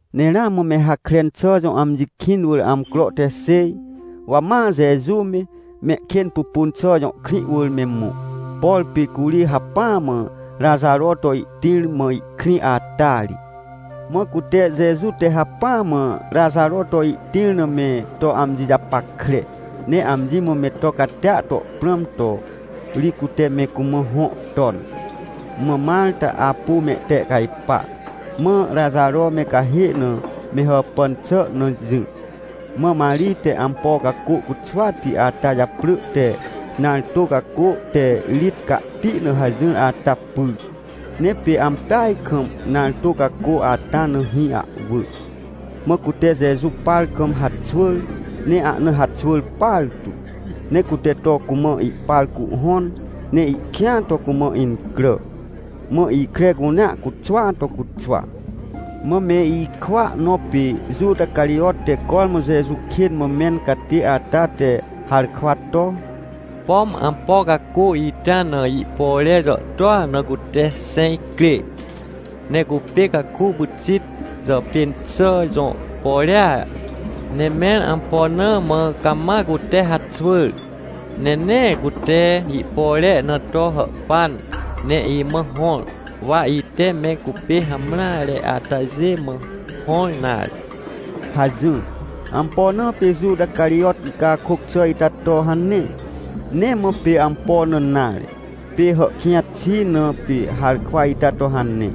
Ne ramã me Hakren xà jõ amji kĩn wỳr amcro te xêj, wa ma Jeju me, Mehkênpupunxà jõ krĩ wỳr me mõ. Por pê curi hacpỹa mã Raxaro to ihtĩr mã ihkrĩ ata ri. Mã cute Jeju te hacpỹa mã Raxaro to ihtĩr na me to amji japackre, ne amji mã me to catia to prãm to ri, cute me cumã hõ ton. Mã Marta apu mehtehcajpa, mã Raxaro me cahê na me hàpàn xà na jỹ. Mã Marij te ampo cacô cuxwati ata japrỳ te nartô cacô te rit cahti na hajỹr ata pyr. Ne pê ampeaj kam nartô cacô ata na hĩ ahwỳ. Mã cute Jeju par kam haxwỳr, ne ahna haxwỳr partu ne cute to cumã ihpar cuhhõn, ne ihkĩa to cumã incrà, mã ikre cunea cuxwaa to cuxwa. Mã me ikwỳa nõ pê Juta Carijot te cormã Jeju kên mã mẽn catê ata te harkwa to: — Pom ampo cacô ita na ihpore jàhtô na cute xẽj crê, ne cupê caku pyxit jàpên xà jõ porea. Ne mẽr ampo na mã cama cute haxwỳr, ne nee cute ihpore na to hàhpan ne imã hõr, wa ite me cupê hamreare atajê mã hõr nare? — hajỹr. Ampo na pê Juta Carijot ihcakôc xà ita to hane? Nee mã pê ampo na nare. Pê hàhkĩj xi, na pê harkwa ita to hane.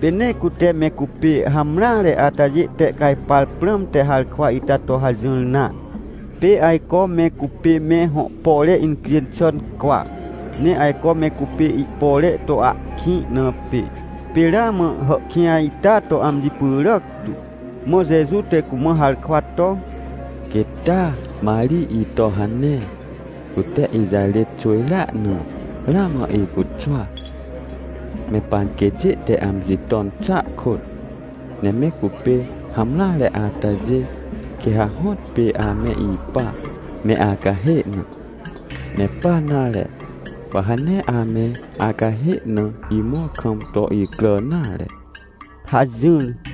Pê nee cute me cupê hamreare atajê tehcajpar prãmte harkwa ita to hajỹr nare. Pê ajco me cupê me hõ pore incjên xà cwa, ne ajco me cupê ihpore to ahkĩ na pê. Pê ramã hàhkĩj ita to amji pyràc tu. Mã Jeju te cumã harkwa to: — Quêt taa Marij ito hane! Cute ijarêt xwỳjrea na ramã icuxwa, me panquêtjê te amji ton xàa kôt. Ne me cupê hamreare atajê, quê ha hõtpê ame ipa me acahê na. Ne pa nare, wa ha nee ame acahê na imõr kam to icrà nare — hajỹr.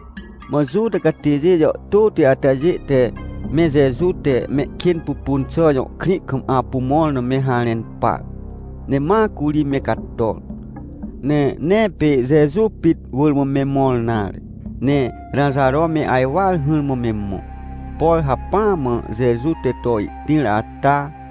Mã Juta catêjê jàhtôti atajê te me Jeju te Mehkênpupunxà jõ krĩ kam apu mõr na me harẽn par. Ne ma curi me cator. Ne nee pê Jeju pit wỳr me mõr nare, ne Raxaro me ajwar hỹrmã me mõ, por hacpỹa mã Jeju te to ihtĩr ata.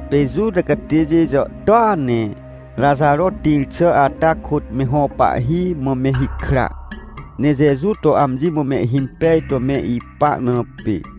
Pê Juta catêjê jàhtôa ne Raxaro tĩr xà ata kôt, me hõ pahhi mã me hikra, ne Jeju to amji mã mehhimpej to me ipa na pê.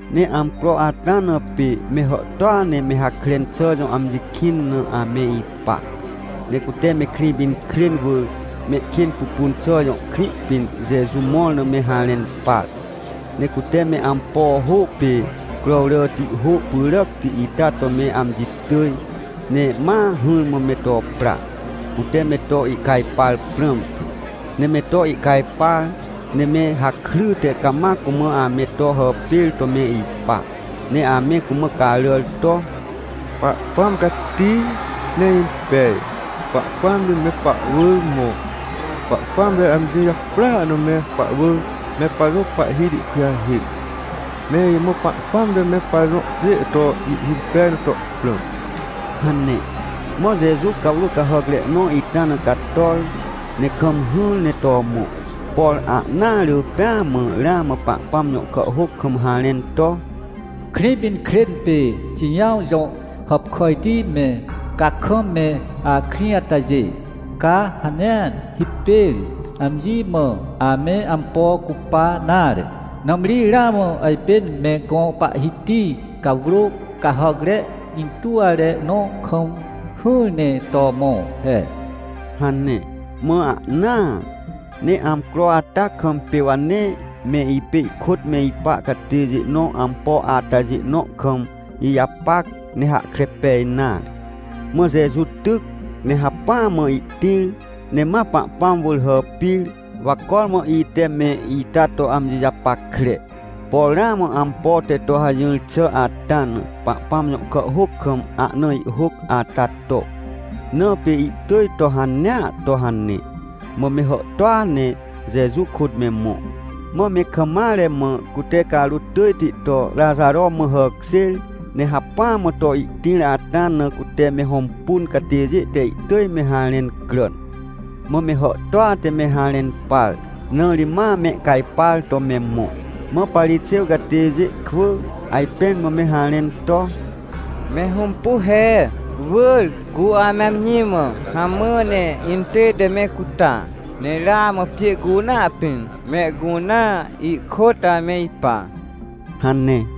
Ne amcro ata na, pê me hàhtôa ne me Hakren xà jõ amji kĩn na ame ipa. Ne cute me Krĩpinkrên wỳr Mehkênpupunxà jõ krĩ pĩn Jeju mõr na me harẽn par. Ne cute me ampo hô pê crowràti hô pyràcti ita to me amji tỳj, ne ma hỹrmã me to pra, cute me to ihcajpar prãmte. Ne me to ihcajpar, ne me hakryte cama cumã ame to hàpêr to me ipa, ne ame cumã caràr to: — Pahpãm cati ne impej! Pahpãm ri me pahwỳr mõ! Pahpãm te amji japrỳa na me pahwỳr me pajõ Pahhiti kujahêc! Me imã Pahpãm te me pajõ pjê to ihhimpej na to prãm! — hane. Mã Jeju cawrô cahàcre nõ ita na cator, ne kam hỹr ne to mõ. Por ahnaa rỳ pêa mã ramã Pahpãm jõ kàhhôc kam harẽn to: “Krĩpinkrên pê Xijãw jõ hàpkàjti me, ca kam me akrĩ atajê, ca ha nee hipêr amji mã ame ampo cupa nare. Nãmri ramã ajpên me gõ Pahhiti cawrô cahàcre intuwre nõ kam hỹr ne to mõ he” hane, mã ahnaa. Ne amcro ata kam pê wa nee me ipê ihkôt me ipa catêjê nõ ampo atajê nõ kam ijapac, ne hahkre pej nare. Mã Jeju tyc, ne hacpỹa mã ihtĩr, ne ma Pahpãm wỳr hàpir, wa cormã ite me ita to amji japackre, por ramã ampo te to hajỹr xà ata na Pahpãm jõ kàhhôc kam ahna ihhôc ata to. Na pê ihtỳj to hanea to hane. Mã me hàhtôa ne Jeju kôt me mõ, mã me kam mare mã cute carôt tỳjti to Raxaro mã hàkjêr, ne hacpỹa mã to ihtĩr ata na, cute me hõmpun catêjê te ihtỳj me harẽn cràn. Mã me hàhtôa te me harẽn par, na ri ma mehcajpar to me mõ. Mã Parixêw catêjê kwỳ ajpẽn mã me harẽn to: — Me hõmpu he, wỳr cu ame amji mã hamã ne intête me cuta. Ne ramã pjê cunea pĩn mehcunea ihkôt ame ipa — hane.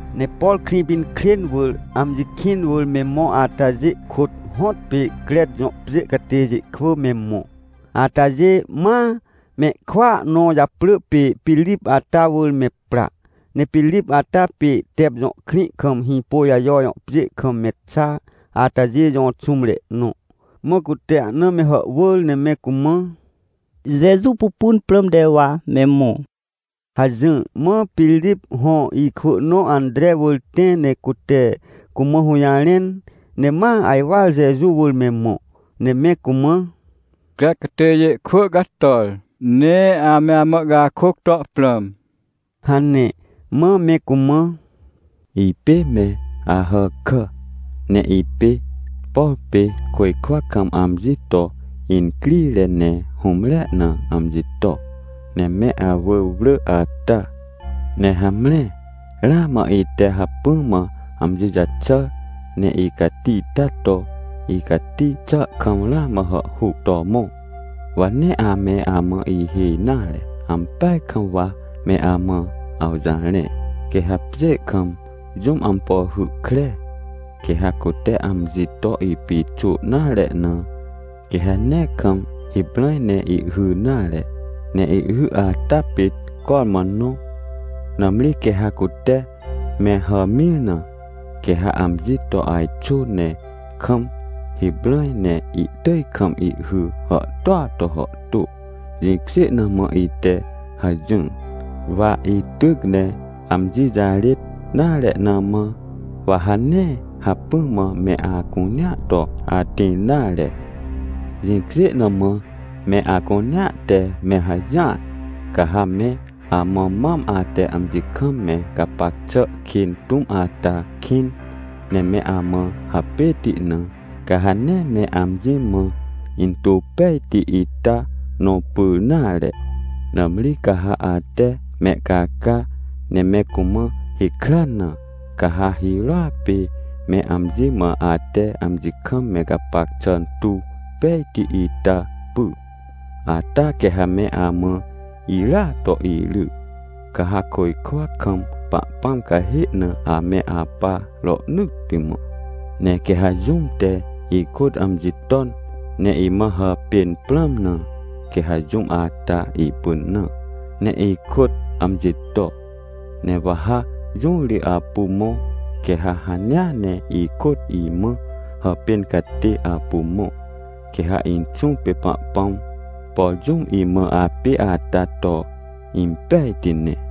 Ne por Krĩpinkrên wỳr, amji kĩn wỳr me mõ atajê kôt hõtpê Crec jõ pjê catêjê kwỳ me mõ. Atajê ma me ikwỳa nõ japrỳ pê Pirip ata wỳr me pra. Ne Pirip ata pê Tep jõ krĩ kam Hĩpôjajo jõ pjê kam me xa atajê jõ xũmre nõ. Mã cute ahna me hàhwỳr, ne me cumã: — Jeju pupun prãmte wa me mõ — hajỹr. Mã Pirip hõ ikwỳ nõ Antre wỳr tẽ, ne cute cumã hũjarẽn, ne ma ajwar Jeju wỳr me mõ, ne me cumã: — Crec catêjê kwỳ cator, ne ame amã ihcakôc to prãm — hane. Mã me cumã: — Ipê me Ahàkà, ne ipê, por pê côjkwa kam amji to incrire ne hũmrea na amji to, ne me awỳr wrỳ ata. Ne hamre ramã ite hacpỹ mã amji jaxàr, ne icati taa to, icati xàa kam ramã hàhhuc to mõ. Wa nee ame amã ihêj nare, ampeaj kam wa me amã awjarẽ. Quê ha pjê kam jũm ampo hy kre, quê ha cute amji to ipixô nare na, quê ha nee kam hiprãj ne ihhy nare, ne ihhy atapit cormã nõ. Nãmri quê ha cute me hàmĩr na, quê ha amji to ajxô ne kam hiprãj ne ihtỳj kam ihhy hàhtôa to hàhtô. Jĩkjê na mã ite hajỹr. Wa ityc ne amji jarêt nare na mã, wa ha nee hacpỹa mã me acunea to atĩr nare. Jĩkjê na mã me acunea te me hajỹar. Ca ha me amã mam ate amji kam me gapac xà kên tũm ata kĩn, ne me amã hapêti na, ca ha nee me amji mã intuw pejti ita nõ pyr nare. Nãmri ca ha ate mehcaca, ne me cumã hikran na, ca ha hirôa pê me amji mã ate amji kam me gapac xà tuw pejti ita py. Ata quê ha me amã irya to iry, ca ha côjkwa kam Pahpãm cahê na ame apa rohnỳtti mã. Ne quê ha jũm te ikôt amji ton, ne imã hàpên prãm na, quê ha jũm ata ipynã, ne ikôt amji to. Ne wa ha jũ ri apu mõ, quê ha hanea ne ikôt imã hàpên catê apu mõ. Quê ha Inxũ pê Pahpãm, por jũm imã apê ata to impejti ne.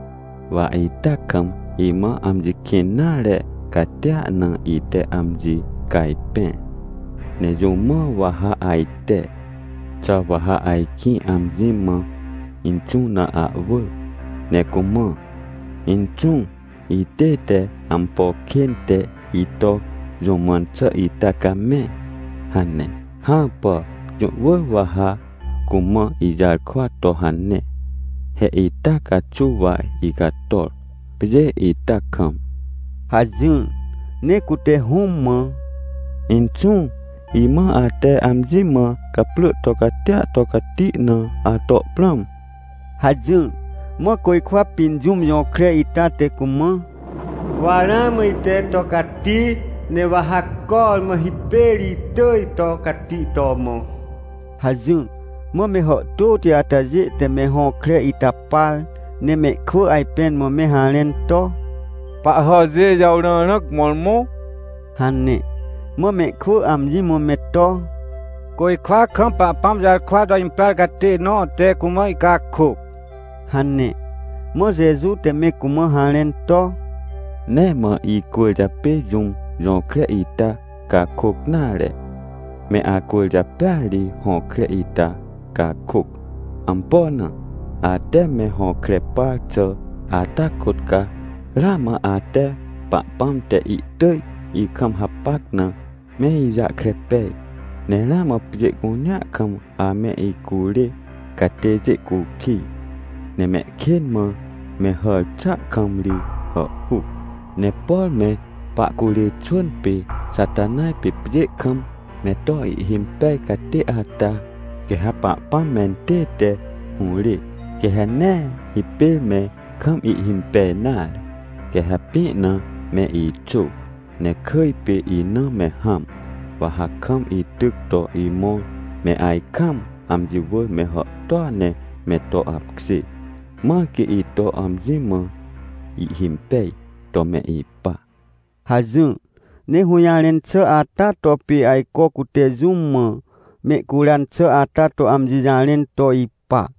— Wa ita kam imã amji kĩn nare catia na ite amji cajpẽr. Ne jũ mã wa ha ajte? Xà wa ha ajkĩ amji mã Inxũ na ahwỳ ne cumã: “Inxũ, itête ampo kên te ito jũ mãn xà ita camẽ” hane? Hãpà, jũ wỳr wa ha cumã ijarkwa to hane, he ita caxuw wa icator, pjê ita kam — hajỹr. Ne cute Hũm mã: — Inxũ, imã ate amji mã gaprỳ to catia to cati na ato prãm — hajỹr. Mã côjkwa pĩn jũm jõkre ita te cumã: — Wa ramã ite to cati, ne wa ha cormã hipêr itỳj to cati to mõ — hajỹr. Mã me hàhtôti atajê te me hõkre ita par, ne mehkwỳ ajpẽn mã me harẽn to: — Pahhàjê jàwrãrãc mõrmõ — hane. Mã mehkwỳ amji mã me to: — Côjkwa kam Pahpãm jarkwa to imprar catê nõ te cumã ihcakôc — hane. Mã Jeju te me cumã harẽn to: — Nee mã icwỳrjapê jũm jõkre ita cakôc nare, me acwỳrjapêa ri hõkre ita cakôc. Ampo na? Ate me hõkre par xà ata kôt ca ramã ate Pahpãm te ihtỳj ikam hapac na, me ijahkre pej. Ne ramã pjê cunea kam ame icurê catêjê cukij ne mehkên mã me hàr xàa kam ri hàhhuc. Ne por me pahcurê xwỳn pê Xatanaj pê pjê kam me to ihhimpej catê ata, quê ha Pahpãm mentête hũrê. Quê ha nee hipêr me kam ihhimpej nare. Quê ha pĩ na me ixô, ne kỳj pê ina me hãm, wa ha kam ityc to imõr me ajkaam amji wỳr me hàhtôa ne me to apkjê, mãr quê ito amji mã ihhimpej to me ipa — hajỹr. Ne hũjarẽn xà ata to pê ajco cute jũ mã mehcuran xà ata to amji jarẽn to ipa.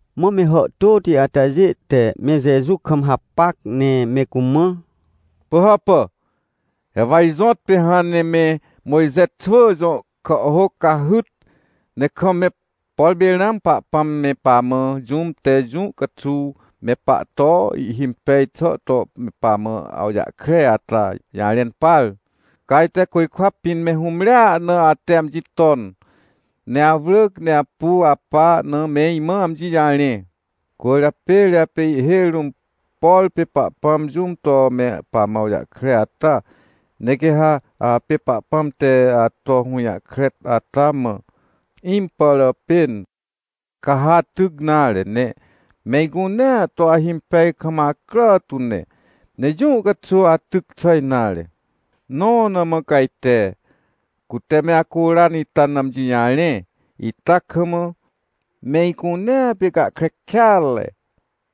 Mã me hàhtôti atajê te me Jeju kam hapac ne me cumã: — Pỳhàpà! He wa ijõtpê hãn ne me Mojxe xwỳ jõ kàhhôc cahyt, ne kam me, por pê ramã Pahpãm me pamã jũm te jũ caxuw me pahto ihhimpej xà to me pamã awjahkre ata jarẽn par. Ca ajte côjkwa pĩn me hũmrea na ate amji ton, ne awrỳc ne apu apa na, me imã amji jarẽ. Cwỳrjapê ri apê ihhêj rũm, por pê Pahpãm jũm to me pamã awjahkre ata. Ne quê ha apê Pahpãm te ato hũjahkre ata mã impàràpên, ca ha atyc nare, ne me icunea to ahimpej kam acrà tu ne, ne jũ caxuw atyc xà nare. Nõ na mã ca ajte, cute me acuran ita na amji jarẽ ita kam, me icunea pê gahkre kêatre.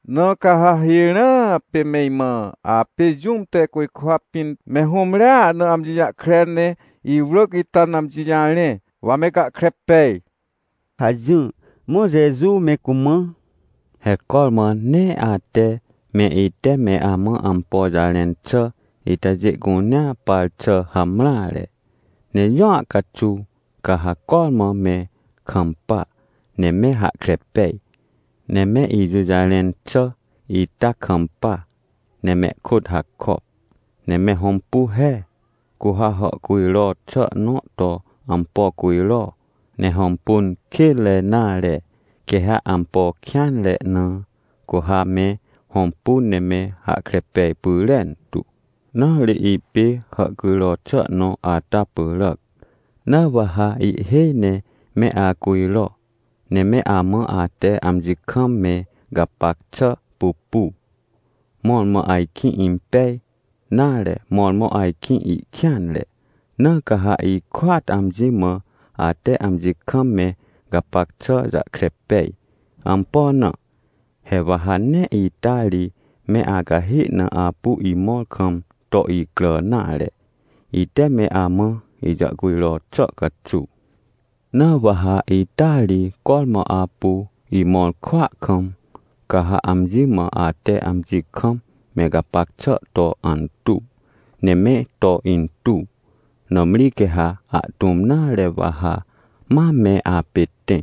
Na ca ha hirãa pê me imã apê jũm te côjkwa pĩn me hũmrea na amji jahkre ne iwrỳc ita na amji jarẽ, wa me gahkre pej — hajỹr. Mã Jeju me cumã: — He cormã nee ate me ite me amã ampo jarẽn xà itajê cunea par xà hamreare, ne jũa caxuw ca ha cormã me kampa ne me hahkre pej. Ne me ijũjarẽn xà ita kampa ne mehkôt hakop. Ne me hõmpu he, cu ha hàhcujro xà nõ to ampo cujro, ne hõmpun kênre nare, quê ha ampo kêanre na, cu ha me hõmpu ne me hahkre pej pyrentu. Na ri ipê hàhcujro xà nõ ata pyràac. Na wa ha ihhêj ne me acujro, ne me amã ate amji kam me gapac xà pupu, mõrmõ ajkĩ impej, nare, mõrmõ ajkĩ ihkêanre. Na ca ha ihkôat amji mã ate amji kam me gapac xà jahkre pej. Ampo na? He wa ha nee ita ri me acahê na apu imõr kam to icrà nare, ite me amã ijàhcujro xà caxuw. Na wa ha ita ri cormã apu imõr kwỳa kam, ca ha amji mã ate amji kam me gapac xà to antuw, ne me to intuw. Nãmri quê ha ahtũm nare wa ha ma me apê tẽ,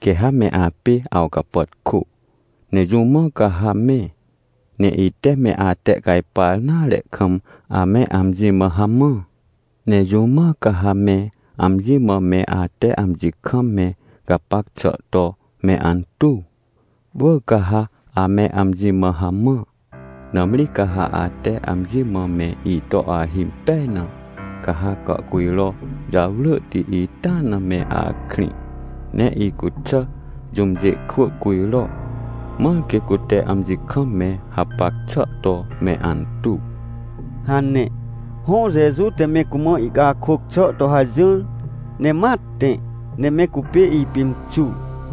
quê ha me apê awcapàtkô, ne jũ mã ca ha me, ne ite me atehcajpar nare kam, ame amji mã hamã? Ne jũ mã ca ha me amji mã me ate amji kam me gapac xà to me antuw? Wỳr ca ha ame amji mã hamã. Nãmri ca ha ate amji mã me ito ahimpej na, ca ha gàhcujro jarwrỳhti ita na me akrĩ, ne icuxà jũmjê kwỳ cujro, mãr quê cute amji kam me hapac xà to me antuw — hane. Hõ, Jeju te me cumã ihcakôc xà to hajỹr, ne ma tẽ, ne me cupê ipimxur.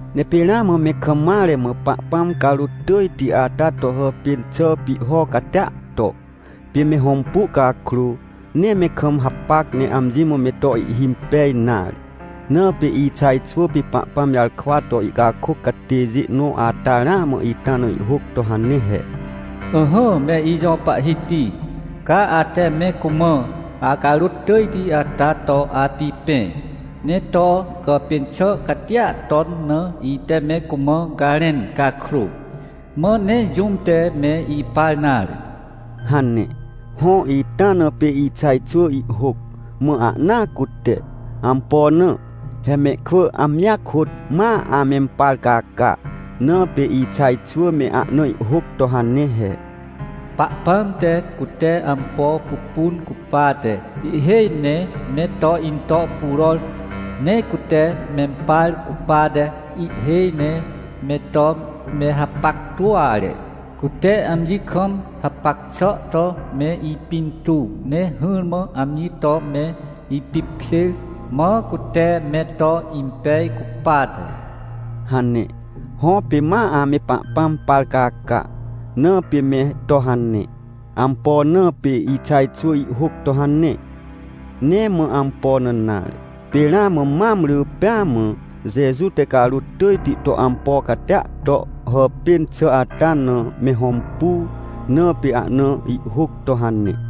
Ne pê ramã me kam mare mã Pahpãm carôt tỳjti ata to hàpên xà pihho catia to, pê me hõmpu cakrô, nee me kam hapac ne amji mã me to ihhimpej nare. Na pê Ixaj xwỳ pê Pahpãm jarkwa to ihcakôc catêjê nõ ata ramã ita na ihhôc to hane he: “Ỹhỹ me ijõ Pahhiti, ca ate me cumã acarôt tỳjti ata to apipẽ, ne to gàpên xà catia ton na ite me cumã garẽn cakrô, mã nee jũm te me ipar nare” hane. Hõ, ita na pê Ixaj xwỳ ihhôc, mã ahnaa cute. Ampo na? He mehkwỳ amjia kôt ma amempar caca, na pê Ixaj xwỳ me ahna ihhôc to hane he: “Pahpãm te cute ampo pupun cupate, ihhêj ne me to into puror, ne cute mempar cupate, ihhêj ne me to me hapactuare. Cute amji kam hapac xà to me ipintuw ne hỹrmã amji to me ipipkjêr, mã cute me to impej cupate” hane. Hõ, pê ma ame Pahpãm par caca, na pê me to hane. Ampo na pê Ixaj xwỳ ihhôc to hane? Nee mã ampo na nare, pê ramã mam rỳ pêa mã Jeju te carôt tỳjti to ampo catia to hàpên xà ata na me hõmpu, na pê ahna ihhôc to hane.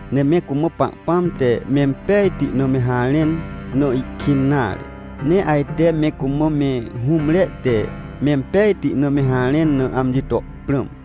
Ne me cumã Pahpãm te mempejti na me harẽn na ihkĩn nare, ne ajte me cumã me hũmre te mempejti na me harẽn na, amji to prãm.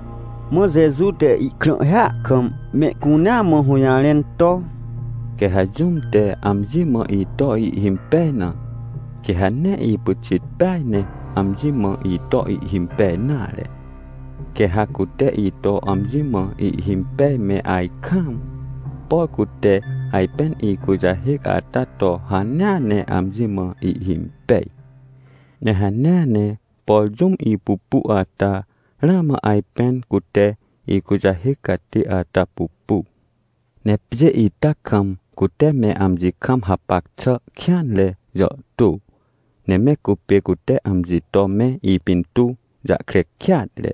Mã Jeju te ihkrãhhia kam mehcunea mã hũjarẽn to: — Quê ha jũm te amji mã ito ihhimpej na, quê ha nee ipyxit peaj ne amji mã ito ihhimpej nare. Quê ha cute ito amji mã ihhimpej me ajkaam, por cute ajpên ikujahêc ata to hanea ne amji mã ihhimpej. Ne hanea ne, por jũm ipupu ata, ramã ajpên cute ikujahêc catê ata pupu. Ne pjê ita kam cute me amji kam hapac xà kêanre jàhtô, ne me cupê cute amji to me ipintuw jahkre kêatre.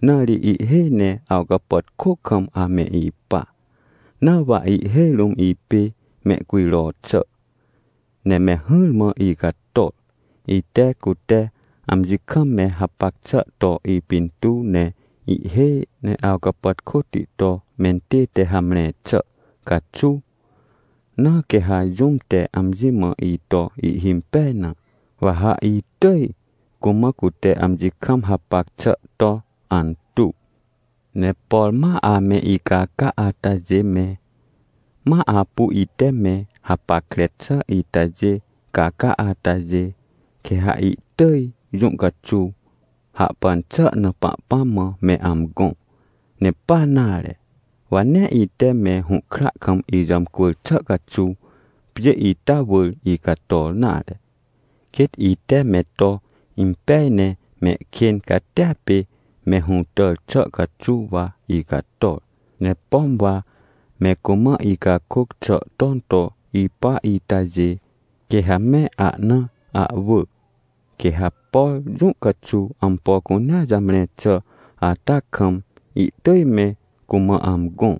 Na ri ihhêj ne awcapàtkô kam ame ipa. Na wa ihhêj rũm ipê mehcujro xà, ne me hỹrmã icator, ite cute amji kam me hapac xà to ipintuw ne ihhêj ne awcapàtkôti to mentête hamre xà caxuw. Na quê ha jũm te amji mã ito ihhimpej na, wa ha itỳj cumã cute amji kam hapac xà to antuw. — Ne por ma ame icaca atajê me, ma apu ite me hapackre xà itajê caca atajê, quê ha ihtỳj jũ caxuw hahpan xà na Pahpãm mã me amgõ. Ne pa nare, wa nee ite me hũhkra kam ijàmcwỳr xà caxuw pjê ita wỳr icator nare. Quêt ite me to impej ne mehkên catia pê me hũtàr xà caxuw wa icator. Ne pom wa me cumã icakôc xà ton to ipa itajê, quê ha me ahna ahwỳ, quê ha, por jũ caxuw ampo cunea jamre xà ata kam, ihtỳj me cumã amgõ.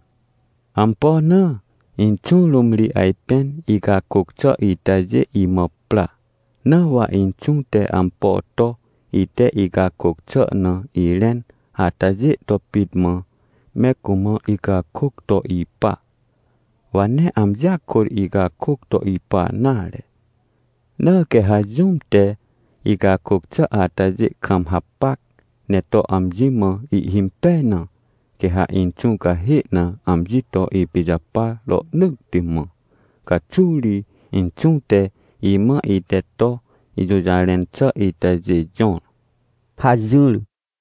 — Ampo na? Inxũ rũm ri ajpên icakôc xà itajê imã pra. Na wa Inxũ te ampo to, ite icakôc xà na irẽn atajê to pit mã, me cumã icakôc to ipa. Wa nee amjia kôt icakôc to ipa nare. Na quê ha jũm te icakôc xà atajê kam hapac, ne to amji mã ihhimpej na, quê ha Inxũ cahê na amji to ipijapar rohnỳtti mã. Caxuw ri, Inxũ te imã ite to ijũjarẽn xà itajê jõr — hajỹr.